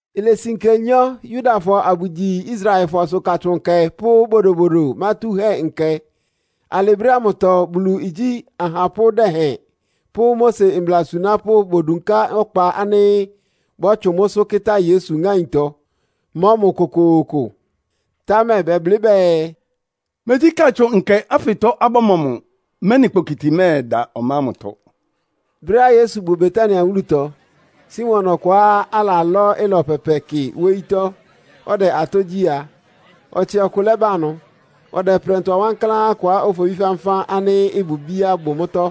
Ilesi nkenyɔ́ Yudafɔ abʋgyi Israelfɔsʋ Katsʋn Nkɛ pʋ́ Bodobodo Mátúhɛ́Nkɛ. Alɩ brɛ́ ámʋtɔ Bulu igyí ahapʋ́ dɛhɛn pʋ́ Mose mbla asunápʋ́ bodunká ɔkpa ánɩ́ bɔ́tsʋn mʋ́sʋ́ kɩ́tá Yesu ŋáintɔ, mɔ́ mʋ kokooko. Támɛ bɛblɩ́ bɛɛ, “Megyí Katsʋn Nkɛ ánfɩtɔ abɔ́mɔ mʋ, mɛ́nɩ kpokiti mɛ́ɛda ɔmá ámʋtɔ.” Brɛ́á Yesu bʋ Betania wúlutɔ, Simon ɔkʋá alalɔ́ ɩlɔ pɛpɛ kɩ wóyítɔ́ ɔdɛ atɔ́ gyí a, ɔtsɩ ɔkʋ lɛ́ba ɩnʋ; ɔdɛ prɛntʋa wankláán kʋá ofobí fánfán ánɩ́ ɩbʋ ibíá bʋ mʋ́tɔ́.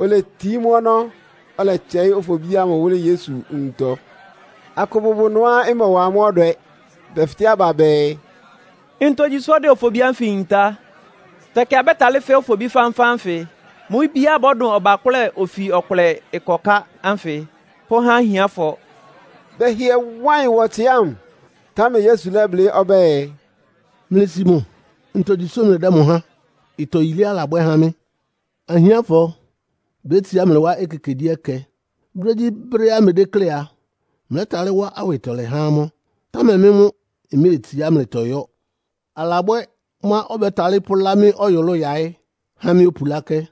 Oletií mʋ́ ɔnɔ́, ɔlɛtsɛɩ́ ofobí ámʋ wʋ́lɩ́ Yesu nwuntɔ. Akʋ bʋbʋ ɩnʋá ɩmɔwa amʋ́ ɔdwɛ. Bɛfɩtɛ́ aba bɛɛ, “Ntogyi sʋ́ ɔdɛ ofobí ánfɩ yintá? Tɛkɩ abɛ́talɩ́ fɛ́ ofobí fánfán ánfɩ, mʋ́ ibíá bɔ́dʋn ɔbakʋ́lɛ ofi ɔkʋlɛ ɩkɔká ánfɩ, pʋ́há ahiánfɔ.” Bɛhɩɛ wá ɩyɩn wá ɔtsɩ ámʋ. Támɛ Yesu lɛ́blɩ́ ɔbɛ́ɛ, “Mlɩsi mʋ! Ntogyi sʋ́ mlɩdɛ́ mʋ háan? Ɩtɔ yilé alabwɛ́ há mɩ́. Ahiánfɔ bétsiá mlɩ wá ekekegyíɛkɛ. Brégyíbrɛ́á mlɩdéklé a, mlɛ́talɩ́ wá awɩtɔlɛ há amʋ́, támɛ mɩ́ mʋ́ mméetsiá mlɩtɔ yɔ́. Alabwɛ́ mʋ́á ɔbɛ́talɩ́ pʋ́lá mɩ́ ɔyʋlʋ́ʋ yáɩ́ há mɩ́ opulákɛ́.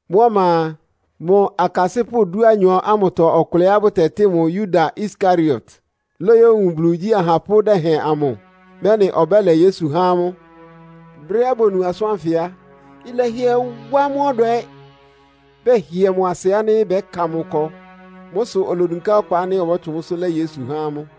Mʋ́ ɔma a, mʋ akasɩ́pʋ́ dúanyɔ ámʋtɔ ɔkʋlɛá bʋtɛtɩ́ mʋ Yuda Iskariot lóyówun Bulu igyí ahapʋ́ dɛhɛn amʋ, mɛ́nɩ ɔbɛ́lɛ Yesu há amʋ́. Brɛ́á bonu asʋ́n ánfɩ á, ɩlɛhɩɛ wá amʋ́ ɔdwɛ. Bɛhɩɛ mʋ asɩ ánɩ́ bɛ́ka mʋ ɩkɔ. Mʋ́ sʋ olodunká ɔkpa ánɩ́ ɔbɔ́tsʋn mʋ́sʋ́ lɛ́ Yesu há amʋ́.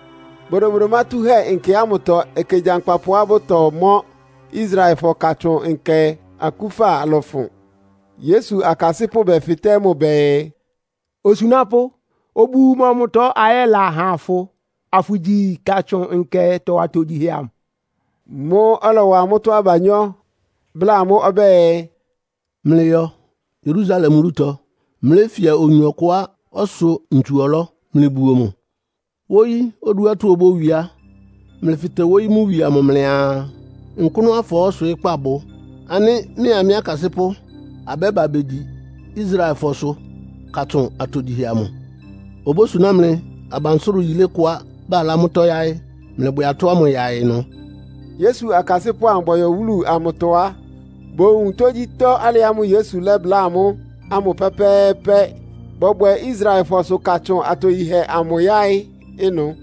Bodobodo Mátúhɛ́Nkɛ ámʋtɔ ɛkɛ gyankpapʋá bʋtɔmɔ́ Israelfɔsʋ Katsʋn Nkɛ akúfa lɔ́fʋn. Yesu akasɩ́pʋ́ bɛfɩtɛ́ mʋ bɛɛ, “Osunápʋ́, obu mɔmʋtɔ ayɛla ha fʋ, afʋgyi Katsʋn Nkɛtɔ atogyihɛ amʋ?” Mʋ́ʋ́ ɔlɔwa amʋ́tɔ́ abanyɔ́, bláa amʋ́ ɔbɛ́ɛ, “Mlɩyɔ Yerusalem wúlutɔ, mléfia oyin ɔkʋá ɔsʋ ntsu-ɔlɔ́, mlɩbuo mʋ. Wóyí oduátɔ́ obówie á, mlɩfɩtɛ wóyí mʋ wie amʋ mlɩaa, ‘Nkʋ́nʋ́ afɔɔ́ ɔswɩɩ́kpá bʋ, ánɩ́ mɩ́a mɩ́ akasɩ́pʋ́ abɛ́ba begyi Israelfɔsʋ Katsʋn atogyihɛ amʋ?’ Obósuná mlɩ abansʋ́rʋ yílé kʋá balá mʋ́tɔ́ yáɩ́. Mlɩbwɛ atɔ́ ámʋ yaɩ ɩnʋ.” Yesu akasɩ́pʋ́ amʋ bɔyɔ wúlu amʋtɔ á, bowun tógyítɔ́ alɩ ámʋ́ʋ́ Yesu lɛ́bláa amʋ́ ámʋ pɛ́pɛ́ɛ́pɛ́, bɔbwɛ Israelfɔsʋ Katsʋn atogyihɛ amʋ yáɩ́ ɩnʋ.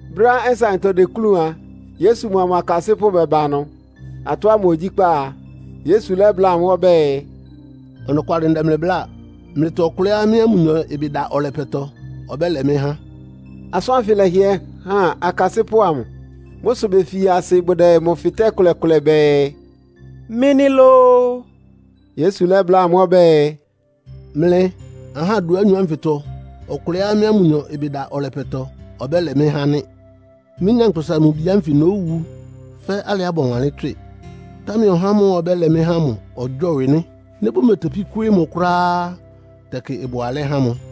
Brɛ́á nsaɩntɔ deklúun a, Yesu mʋa mʋ akasɩ́pʋ́ bɛba ɩnʋ. Atɔ́ ámʋ ogyíkpá a, Yesu lɛ́bláa amʋ́ ɔbɛ́ɛ, “Ɔnɔkwalɩ ndɛ mlɩ bláa, mlɩtɔ ɔkʋlɛá mɩ́a mʋnyɔ ɩbɩ da ɔlɛpɛtɔ ɔbɛ́lɛ mɩ́ há.” Asʋ́n ánfɩ lɛ́hɩɛ han akasɩ́pʋ́ amʋ. Mʋ́ sʋ befi asɩ bʋdɛ mʋ fɩtɛ́ ɩkʋlɛ-kʋlɛ bɛɛ, “Mɩ́ nɩ́ lóó?” Yesu lɛ́bláa amʋ́ ɔbɛ́ɛ, “Mlɩ ahá dúanyɔ ánfɩtɔ ɔkʋlɛá mɩ́a mʋnyɔ ɩbɩ da ɔlɛpɛtɔ ɔbɛ́lɛ mɩ́ há nɩ́. Mɩ́, Nyankpʋsa-Mʋ-Bi ánfɩ nówu fɛ́ alɩá bɔwanlɩ́n tswɩ, támɛ ɔhá ámʋ́ʋ́ ɔbɛ́lɛ mɩ́ há ámʋ ɔgyɔ́wɩ nɩ́. Nɩ́ bʋmetepí kwɩ́ɩ́ mʋ kʋ́ráá á, tɛkɩ ɩbʋ alɛ́ há mʋ.”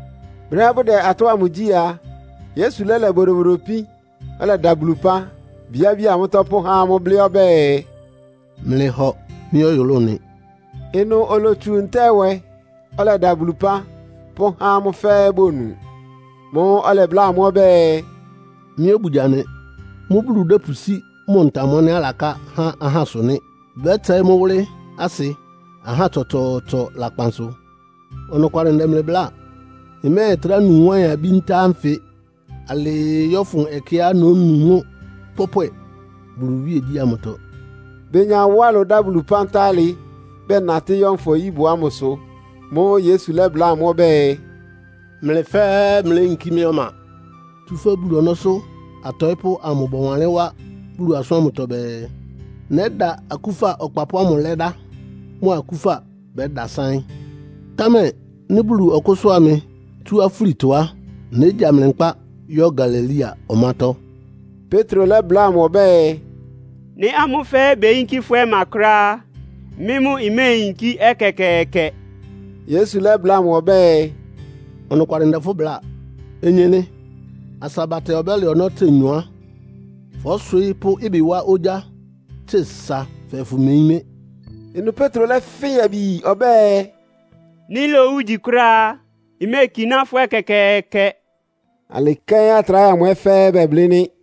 Brɛ́á bʋdɛ atɔ́ ámʋ gyí a, Yesu lɛ́lɛ bodobodo ipín, ɔlɛda Bulu ɩpán, bíábía mʋ́tɔ́ pʋ́há amʋ́, blɩ́ ɔbɛ́ɛ, “Mlɩhɔ, mɩ́ ɔyʋlʋ́ʋ nɩ.” Ɩnʋ olotsu ntá-ɛwɛ, ɔlɛda Bulu ɩpán, pʋ́há amʋ́ fɛ́ɛ́ bonu. Mʋ́ʋ́ ɔlɛbláa amʋ́ ɔbɛ́ɛ, “Mɩ́ obugya nɩ. Mʋ́ Bulu dɛ́pʋsí mʋ ntam ánɩ́ alaká há ahásʋ nɩ́. Bɛ́tsɛɩ́ mʋ́ wʋ́lɩ́ asɩ ahá tsɔtsɔɔtsɔ lakpan sʋ. Ɔnɔkwalɩ ndɛ mlɩ bláa, mmɛ́ɛtrá nu wáɩn-abí ntá ánfɩ alɩɩ yɔ́fʋn ɛkɛá nónu mʋ́ pɔ́pwɛ Bulu iwíegyí ámʋtɔ.” Benya wá ɩlʋ dá Bulu ɩpán tá alɩ, bɛnatɩ́ yɔ́ Nfɔ-nyíbʋ ámʋsʋ. Mʋ́ʋ́ Yesu lɛ́bláa amʋ́ ɔbɛ́ɛ, “Mlɩ fɛ́ɛ́ mléyinkí mɩ́ ɔma. Tsúfɛ́ Bulu ɔnɔ́sʋ́ atɔɩ́pʋ́ amʋ bɔwanlɩ́n wá Bulu asʋ́n ámʋtɔ bɛɛ, ‘Nɛ́da akúfa ɔkpapʋ́ ámʋ lɛ́dá, mʋ akúfa bɛ́dasáɩ́n.’ Támɛ nɩ́ Bulu ɔkʋ́sʋ́a mɩ tsú afúlitɔ á, négya mlɩ nkpá yɔ́ Galilea ɔmátɔ́.” Petro lɛ́bláa mʋ ɔbɛ́ɛ, “Nɩ́ amʋ́ fɛ́ɛ́ beyinkí fʋ́ ɔmá kʋ́ráá á, mɩ́ mʋ́ mméeyinkí ɛkɛkɛɛkɛ.” Yesu lɛ́bláa mʋ ɔbɛ́ɛ, “Ɔnɔkwalɩ ndɛ fʋ́ bláa. Onyenɩ, asa batɛ ɔbɛ́lɛ ɔnɔ́ tse nyɔ á, fɔ́swɩɩ́ pʋ́ ɩbɩ wá ogyá tse sa fɛɛ fʋmeyín mɩ́.” Ɩnʋ Petro lɛ́fɩn yabi yi ɔbɛ́ɛ, “Nɩ́ lowu igyi kʋ́ráá á, mméekiná fʋ́ ɛkɛkɛɛkɛ.” Alɩ kɛ́n atráhɛ amʋ ɛ́ fɛ́ɛ́ bɛblɩ́ nɩ́.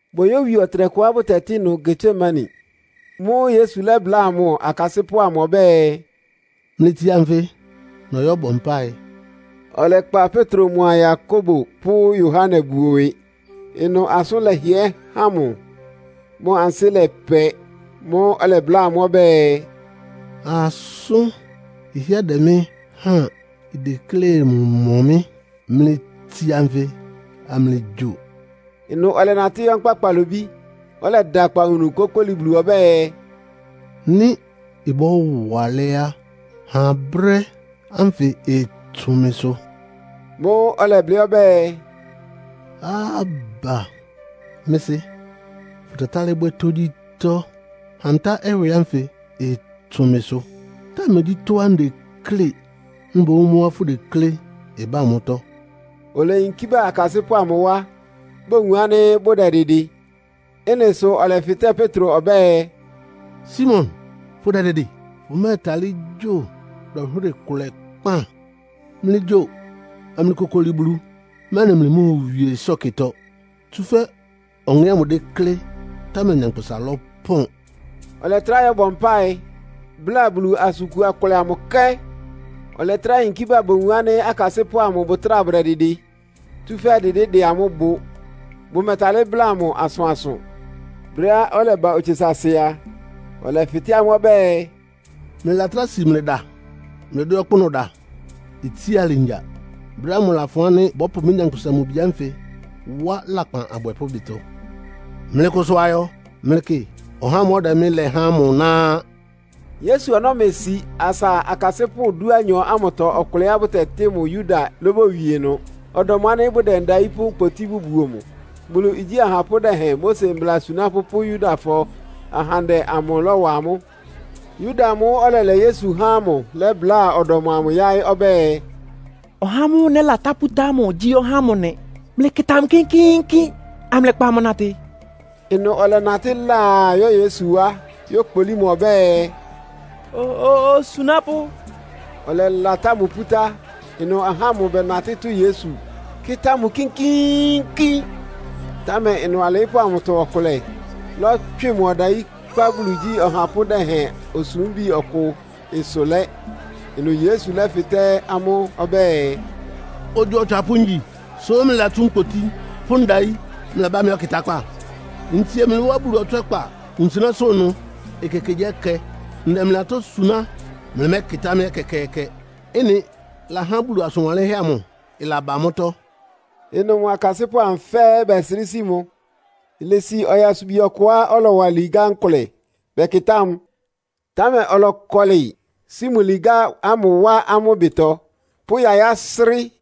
Boyówie ɔtɩnɛkʋá bʋtɛtɩ́ ɩnʋ Getsemane. Mʋ́ʋ́ Yesu lɛ́bláa mʋ akasɩ́pʋ́ amʋ ɔbɛ́ɛ, “Mlɩtsia nfɩ, nɔyɔ́bɔ mpáɩ.” Ɔlɛkpa Petro mʋa Yakobo pʋ́ Yohane buo ɩwɩ. Ɩnʋ asʋ́n lɛhɩɛ́ han mʋ, mʋ ansɩ́ lɛpɛ. Mʋ́ʋ́ ɔlɛbláa amʋ́ ɔbɛ́ɛ, “Asʋ́n ɩhɩ́ɛ́ dɛ mɩ́ háan. Ideklé mɔ mɩ́. Mlɩtsia nfɩ, amlɩgyo.” Ɩnʋ ɔlɛnatɩ́ yɔ́ nkpá kpalobí, ɔlɛda akpawunu kókóli Bulu ɔbɛ́ɛ, “Nɩ́ ɩbɔ́wa alɛ́ á, ha brɛ́ ánfɩ ɩtsʋn mɩsʋ.” Mʋ́ʋ́ ɔlɛblɩ́ ɔbɛ́ɛ, “Abba Mɩ́ Sɩ́, fʋtɛtálɩ́ bwɛ́ tógyítɔ́. Ha ntá-ɛwɛ ánfɩ ɩtsʋn mɩsʋ! Támɛ megyí tɔ́á ndeklé, mboún mʋ́á fʋdeklé ɩbá mʋ́tɔ́!” Oleyinkí bá akasɩ́pʋ́ amʋ wá bowun ánɩ́ bʋdɛdɩdɩ. Ɩ́nɩ sʋ ɔlɛfɩtɛ́ Petro ɔbɛ́ɛ, “Simon, fʋdɛdɩdɩ? Fʋmɛtalɩ́ gyo dɔnhwɩ́rɩ kʋlɛ kpán? Mlɩgyo amlɩkokoli Bulu, mɛ́nɩ mlɩmóowie ɩsɔ́kɩtɔ. Tsúfɛ́ ɔŋɛ́ ámʋ déklé, támɛ nyankpʋsa lɔ́pɔn.” Ɔlɛtrá yɔ́bɔ mpáɩ, bláa Bulu asʋn kua kʋlɛ amʋ kɛ́n. Ɔlɛtrá yinkí ba bowun ánɩ́ akasɩ́pʋ́ amʋ bʋtráa bʋdɛdɩdɩ, tsúfɛ́ dɩdɩ́ dɛ amʋ́ bʋ. Bʋmɛtalɩ́ bláa mʋ asʋansʋ. Brɛ́á ɔlɛba otse saasɩ a, ɔlɛfɩtɛ́ amʋ́ ɔbɛ́ɛ, “Mlɩlatráa si mlɩda mlɩdɛ́ ɔkpʋ́nʋ́ da? Itsía alɩ ngya! Brɛ́ ámʋ lafʋn ánɩ́ bɔ́pʋ mɩ́, Nyankpʋsa-Mʋ-Bi ánfɩ wá lakpan abwɛpʋ́ ɩbɩtɔ. Mlɩkʋsʋ ayɔ. Mlɩkɩ, ɔhá ámʋ́ʋ́ ɔdɛ mɩ́ lɛ há ámʋ ná á!” Yesu ɔnɔ́ mesi asa akasɩ́pʋ́ dúanyɔ ámʋtɔ ɔkʋlɛá bʋtɛtɩ́ mʋ Yuda lóbowie ɩnʋ. Ɔdɔm ánɩ́ bʋdɛ ndayí pʋ́ nkpotí bʋbuo mʋ. Bulu igyí ahapʋ́ dɛhɛn, Mose mbla asunápʋ́ pʋ́ Yudafɔ ahandɛ amʋ lɔ́wa amʋ́. Yuda amʋ́ʋ́ ɔlɛlɛ Yesu há ámʋ lɛ́bláa ɔdɔm amʋ yáɩ́ ɔbɛ́ɛ, “Ɔhá ámʋ́ʋ́ nɛ́latá pútá ámʋ gyí ɔhá ámʋ nɩ. Mlɩkɩta mʋ kínkíínkín, amlɩkpa mʋ natɩ.” Ɩnʋ ɔlɛnatɩ́ laa yɔ́ Yesu wá, yókpolí mʋ ɔbɛ́ɛ, “Osunápʋ́!” Ɔlɛlatá mʋ pútá. Ɩnʋ ahá ámʋ bɛnatɩ́ tʋ́ Yesu, kɩ́tá mʋ kínkíínkín. Támɛ ɩnʋ alɩɩ́pʋ́ amʋtɔ ɔkʋlɛ lɔ́tswɩ mʋ ɔdayí kpá Bulu igyí ɔhapʋ́ dɛhɛn osúmbi ɔkʋ ɩsʋ lɛ́. Ɩnʋ Yesu lɛ́fɩtɛ́ amʋ́ ɔbɛ́ɛ, “Ogyo otswapʋ́ ngyi, sʋ́ mlɩlatsú nkpotí pʋ́ ndayí mlɛbá mɩ́ ɔkɩtákpá? Ntsie mlɩ wá Bulu ɔtswɛ́kpa wunsɩnɛ́sʋ́ ɩnʋ ekekegyíɛkɛ, ndɛ mlɩ atɔ́ suná, mlɩmɛ́kɩtá mɩ́ ɛkɛkɛɛkɛ. Ɩ́nɩ lahá Bulu asʋn wanlɩ́nhɛ́ amʋ ɩlaba mʋ́tɔ́.” Ɩnʋ mʋ akasɩ́pʋ́ amʋ fɛ́ɛ́ bɛsrɩ́ sí mʋ. Ilesi ɔyasubi ɔkʋá ɔlɔwa ligá nkʋlɛ. Bɛkɩtá mʋ, támɛ ɔlɔkɔlɩ, sí mʋ ligá ámʋ wá amʋ́ ɩbɩtɔ, pʋ́ yayá srɩ́.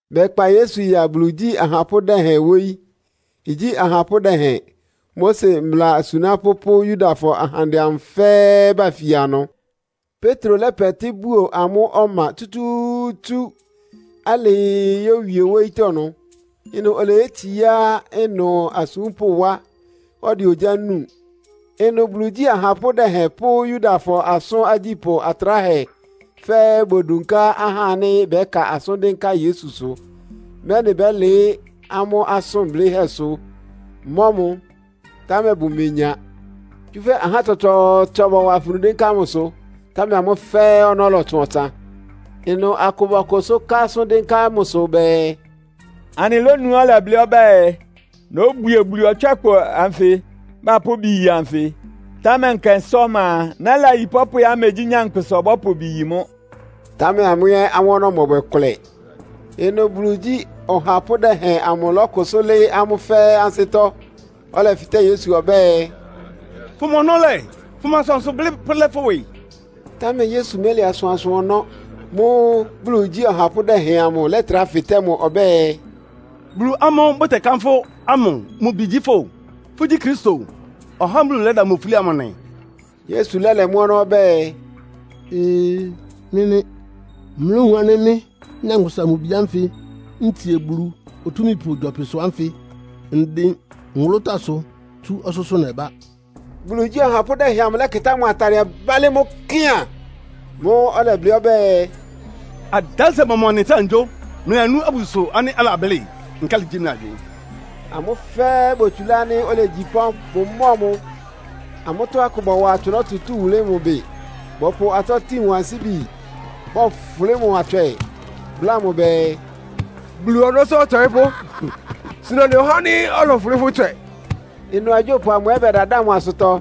Bɛkpa Yesu ya Bulu igyí ɔhapʋ́ dɛhɛn wóyí. Igyí ahapʋ́ dɛhɛn, Mose mbla asunápʋ́ pʋ́ Yudafɔ ahandɛ amʋ fɛ́ɛ́ bafia ɩnʋ. Petro lɛ́pɛtɩ́ buo amʋ́ ɔma tsútsúútsú, alɩɩ yówie wóyítɔ́ ɩnʋ. Ɩnʋ oleyétsiá ɩnʋ asúmpʋ́ wá, ɔdɛ ogyá núu. Ɩnʋ Bulu igyí ahapʋ́ dɛhɛn pʋ́ Yudafɔ asʋ́n agyípʋ́ atráhɛ fɛ́ɛ́ bodunká ahá ánɩ́ bɛ́ka asʋ́n dɩ́nká Yesusʋ, mɛ́nɩ bɛ́lɩɩ́ amʋ́ asʋn blɩ́hɛ́sʋ mɔ́ mʋ, támɛ bʋmenya. Tsúfɛ́ ahá tsɔtsɔɔtsɔ bɔwa afunu dɩ́nká mʋsʋ, támɛ amʋ́ fɛ́ɛ́ ɔnɔ́ lɔtsʋn ɔtsan. Ɩnʋ akʋ bɔkʋsʋ́ ká asʋ́n dɩ́nká mʋsʋ bɛɛ, “Anɩlónuá ɔlɛblɩ́ ɔbɛ́ɛ, ‘Nóbwie Bulu ɔtswɛ́kpa anfɩ bapʋ́ ɩbɩ yi anfɩ, támɛ nkɛnsá ɔma a, nɛ́layi pɔ́pwɛá megyí nyankpʋsa ɔbɔ́pʋ ɩbɩ yi mʋ́.’” Támɛ amʋ́ ɛ́ amʋ́ ɔnɔ́ mɔbwɛ kʋlɛ. Ɩnʋ Bulu igyí ɔhapʋ́ dɛhɛn amʋ lɔ́kʋsʋ́ lɩ́ɩ́ amʋ́ fɛ́ɛ́ ansɩ́tɔ́, ɔlɛfɩtɛ́ Yesu ɔbɛ́ɛ, “Fʋma ɔnɔ́ lɛ́? Fʋma asʋansʋ blɩ́ pʋ́lɛ́ fʋ́ ɩwɩ?” Támɛ Yesu mɛ́lɛ asʋansʋ ɔnɔ́. Mʋ́ʋ́ Bulu igyí ɔhapʋ́ dɛhɛn amʋ lɛ́trá fɩtɛ́ mʋ ɔbɛ́ɛ, “Bulu ámʋ́ʋ́ bʋtɛkánfʋ́ ámʋ mʋ Bi gyí fʋ́? Fʋ́gyí Kristo, (ɔhá ámʋ́ʋ́ Bulu lɛ́da mʋ ofúli amʋ) nɩ?” Yesu lɛ́lɛ mʋ́ ɔnɔ́ ɔbɛ́ɛ, “Ee! Mɩ́ nɩ́! Mlówun ánɩ́ mɩ́, Nyankpʋsa-Mʋ-Bi ánfɩ ntsie Bulu Otúmípʋ gyɔpɩsʋ ánfɩ ndɩn nwʋlʋ́táasʋ tsú ɔsʋ́sʋ́ nɛbá.” Bulu igyí ɔhapʋ́ dɛhɛn amʋ lɛ́kɩtá mʋ atadɩɛ bálɩ́ mʋ́ kɩaan. Mʋ́ʋ́ ɔlɛblɩ́ ɔbɛ́ɛ, “Adánsɩɛ mɔmʋ anɩtráa anɩgyó? Mlɩlanú abususʋ ánɩ́ alablɩ́. Nkálɩ gyí mlɩ agywɩɩn?” Amʋ́ fɛ́ɛ́ botsulá ánɩ́ olegyi pɔ́n, bʋmɔ́ɔ mʋ. Amʋ́tɔ́ akʋ bɔwa atsʋnɔ́ tutúu wʋlɩ́ mʋ bɩ. Bɔpʋ atɔ́ tin mʋ ansíbi, bɔfʋlɩ́ mʋ atswɛ, bláa mʋ bɛɛ, “Bulu ɔnɔ́sʋ́ ɔtɔɩ́pʋ́, suna anɩ ɔhá ánɩ́ ɔlɔfʋlɩ́ fʋ́ ɩtswɛ!” Ɩnʋ agyópʋ amʋ ɛ́ bɛdadáa mʋ asʋtɔ.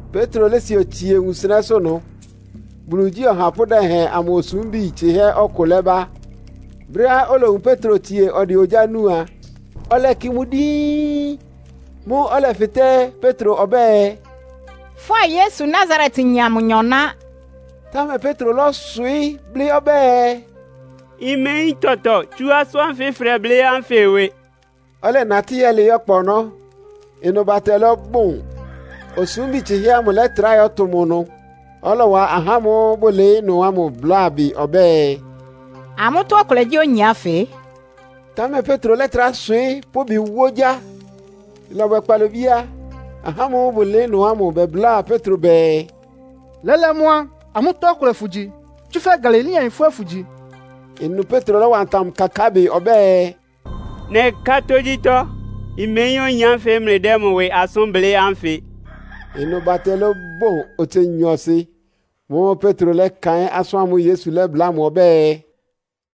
Petro lési otsie wunsɩnɛ́sʋ́ ɩnʋ, Bulu igyí ɔhapʋ́ dɛhɛn amʋ osúmbi tsɩ́hɛ́ ɔkʋ lɛ́ba. Brɛ́á olowun Petro tsie ɔdɛ ogyá núu a, ɔlɛkɩ mʋ díín. Mʋ́ʋ́ ɔlɛfɩtɛ́ Petro ɔbɛ́ɛ, “Fʋ́a Yesu Nasaretyin amʋ nyɔ ná.” Támɛ Petro lɔ́swɩɩ́ blɩ́ ɔbɛ́ɛ, “Mmeyín tɔtɔ tsú asʋ́n ánfɩ fʋdɛblɩ́ ánfɩ ɩwɩ!” Ɔlɛnatɩ́ yɛ́lɩɩ́ ɔkpa ɔnɔ́, ɩnʋ batɛ lɔ́bʋn. Osúmbi tsɩ́hɛ́ ámʋ lɛ́trá yɔ́tʋ mʋ ɩnʋ, ɔlɔwa ahá ámʋ́ʋ́ bʋlɩɩ́ ɩnʋ ámʋ bláa bɩ ɔbɛ́ɛ, “Amʋ́tɔ́ ɔkʋlɛ gyí oyin ánfɩ.” Támɛ Petro lɛ́trá swɩɩ́ pʋ́ ɩbɩ wá ogyá. Ɩlɔbwɛ kpalobí á, ahá ámʋ́ʋ́ bʋlɩɩ́ ɩnʋ ámʋ bɛbláa Petro bɛɛ, “Lɛ́lɛ́ mʋ́ á, amʋ́tɔ́ ɔkʋlɛ fʋgyi, tsúfɛ́ Galileayin fʋ́ ɛ́ fʋ́gyi?” Ɩnʋ Petro lɔ́wa ntam kakáa bɩ ɔbɛ́ɛ, “Nɛká tógyítɔ́, mmeyín oyin ánfɩ mlɩdɛ́ mʋ ɩwɩ asʋ́n blɩ́ ánfɩ.” Ɩnʋ batɛ lɔ́bɔn otse nyɔɔsɩ. Mʋ́ʋ́ Petro lɛ́kaɩ́n asʋ́n ámʋ́ʋ́ Yesu lɛ́bláa mʋ ɔbɛ́ɛ,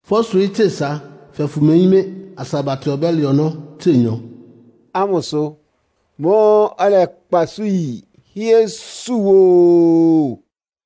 “Fɔ́swɩɩ́ tse sa fɛɛ fʋmeyín mɩ́ asa batɛ ɔbɛ́lɛ ɔnɔ́ tse nyɔ.” ámʋsʋ. Mʋ́ʋ́ ɔlɛkpa isú yi, hɩ́ɛ́ sú woo.